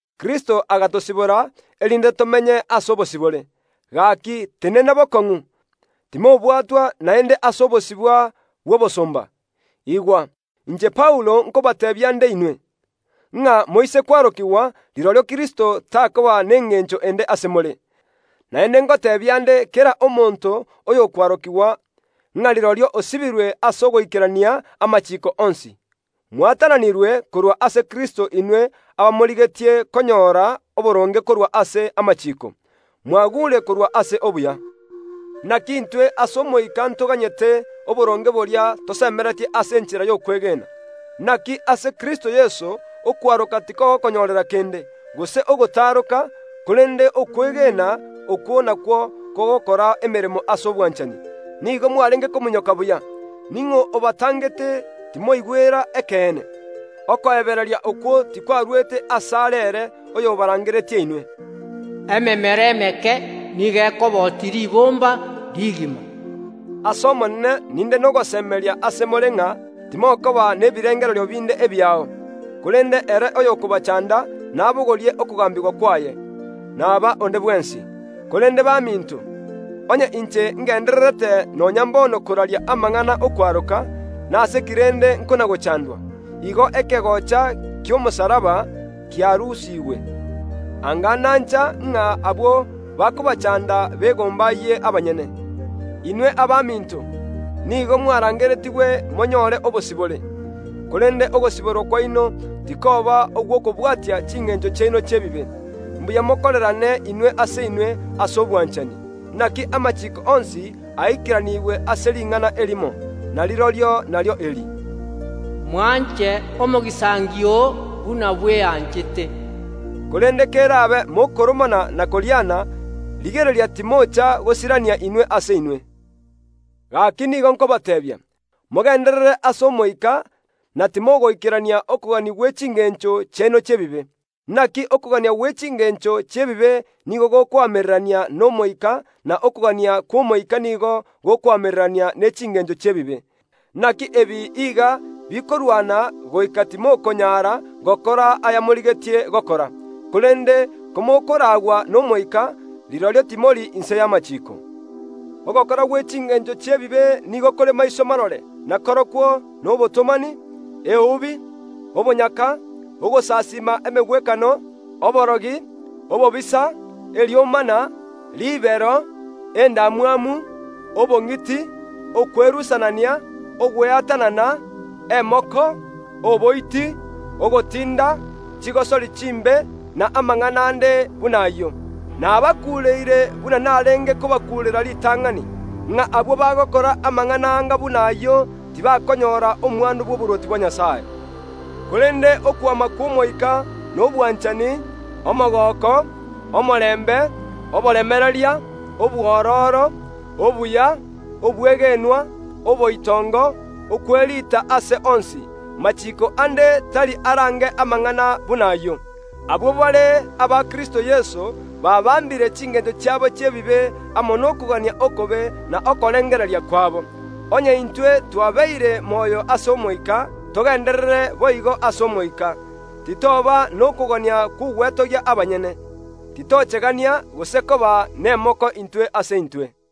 Kristo agatosibora, erinde tomenye ase obosibore; gaki tenena bokong’u, timobwatwa naende ase obosibwa bw’obosomba. Igwa, inche Paulo nkobateebia nde inwe, ng’a moise kwarokigwa, rirorio Kristo takoba nengencho ende ase more. Naende ngoteebia nde kera omonto oyokwarokigwa, ng’a rirorio osibirwe ase ogoikerania amachiiko onsi. Mwatananirwe korwa ase Kristo, inwe abamorigetie konyora oboronge korwa ase amachiiko, mwagure korwa ase obuya. Naki intwe ase Omoika ntoganyete oboronge boria tosemeretie ase enchera y’okwegena. Naki ase Kristo Yeso okwaroka tikogokonyorera kende, gose ogotaroka, korende okwegena okwo nakwo kogokora emeremo ase obwanchani. Nigo mwarenge kominyoka buya; ning’o obatangete timoigwera ekeene? Okoebereria okwo tikwarwete asare ere oyobarangeretie inwe. Ememera emeke nigo ekobotia ribomba rigima. Ase Omonene ninde nogosemeria ase more ng’a timokoba nebirengererio binde ebiao, korende ere oyokobachanda nabogorie okogambigwa kwaye, naba onde bwensi. Korende baminto, onye inche ngendererete nonya mbono koraria amang’ana y’okwaroka, nase ki rende nkona‐gochandwa? Igo ekegocha ki’omosalaba kiarusigwe. Anga nancha ng’a abwo bakobachanda begombayie abanyene. Inwe abaminto, nigo mwarangeretigwe monyore obosibore; korende ogosiborwa kwaino tikoba ogw’okobwatia chingencho chiaino chi’ebibe, mbuya mokorerane inwe ase inwe ase obwanchani. Naki amachiiko onsi aikeranigwe ase ring’ana erimo, na rirorio nario eri, “Mwanche omogisangio oo buna bweanchete.” Korende kerabe mokoromana na koriana, rigereria timocha gosirania inwe ase inwe. Gaki nigo nkobateebia, mogenderere ase Omoika na timogoikerania okogania gwe chingencho chiaino chi’ebibe. Naki okogania gwe chingencho chi’ebibe nigo gokoamererania n’Omoika na okogania kw’Omoika nigo gokoamererania ne chingencho chi’ebibe; naki ebi iga bikorwana goika timokonyara gokora ayamorigetie gokora. Korende komokoraagwa n’Omoika, rirorio timori inse y’amachiiko. Ogokora gwe chingencho chi’ebibe nigo kore maiso marore na korokwo nobotomani, eubi, obonyaka, ogosasiima emegwekano, oborogi, obobisa, eriomana, ribero, endamwamu, obong’iti, okwerusanania, ogweatanana, emoko, oboiti, ogotinda, chigosori chimbe, na amang’ana ande buna ayio. Nabakuureire buna narenge kobakuurera ritang’ani, ng’a abwo bagokora amang’ana anga buna ayio, tibakonyora omwando bw’oborwoti bwa Nyasae. Korende okwama kw’Omoika nobwanchani, omogooko, omorembe, oboremereria, obwororo, obuya, obwegenwa, oboitongo, okwerita ase onsi; machiko ande tari arange amang’ana buna ayio. Abwo bare abakristo Yeso baabambire chingencho chiabo chi’ebibe amo nokogania okobe na okorengereria kwabo. Onye intwe twabeire moyo ase Omoika, togenderere boigo ase Omoika. Titoba nokogania kw’ogwetogia abanyene, titochegania, gose koba nemoko intwe ase intwe.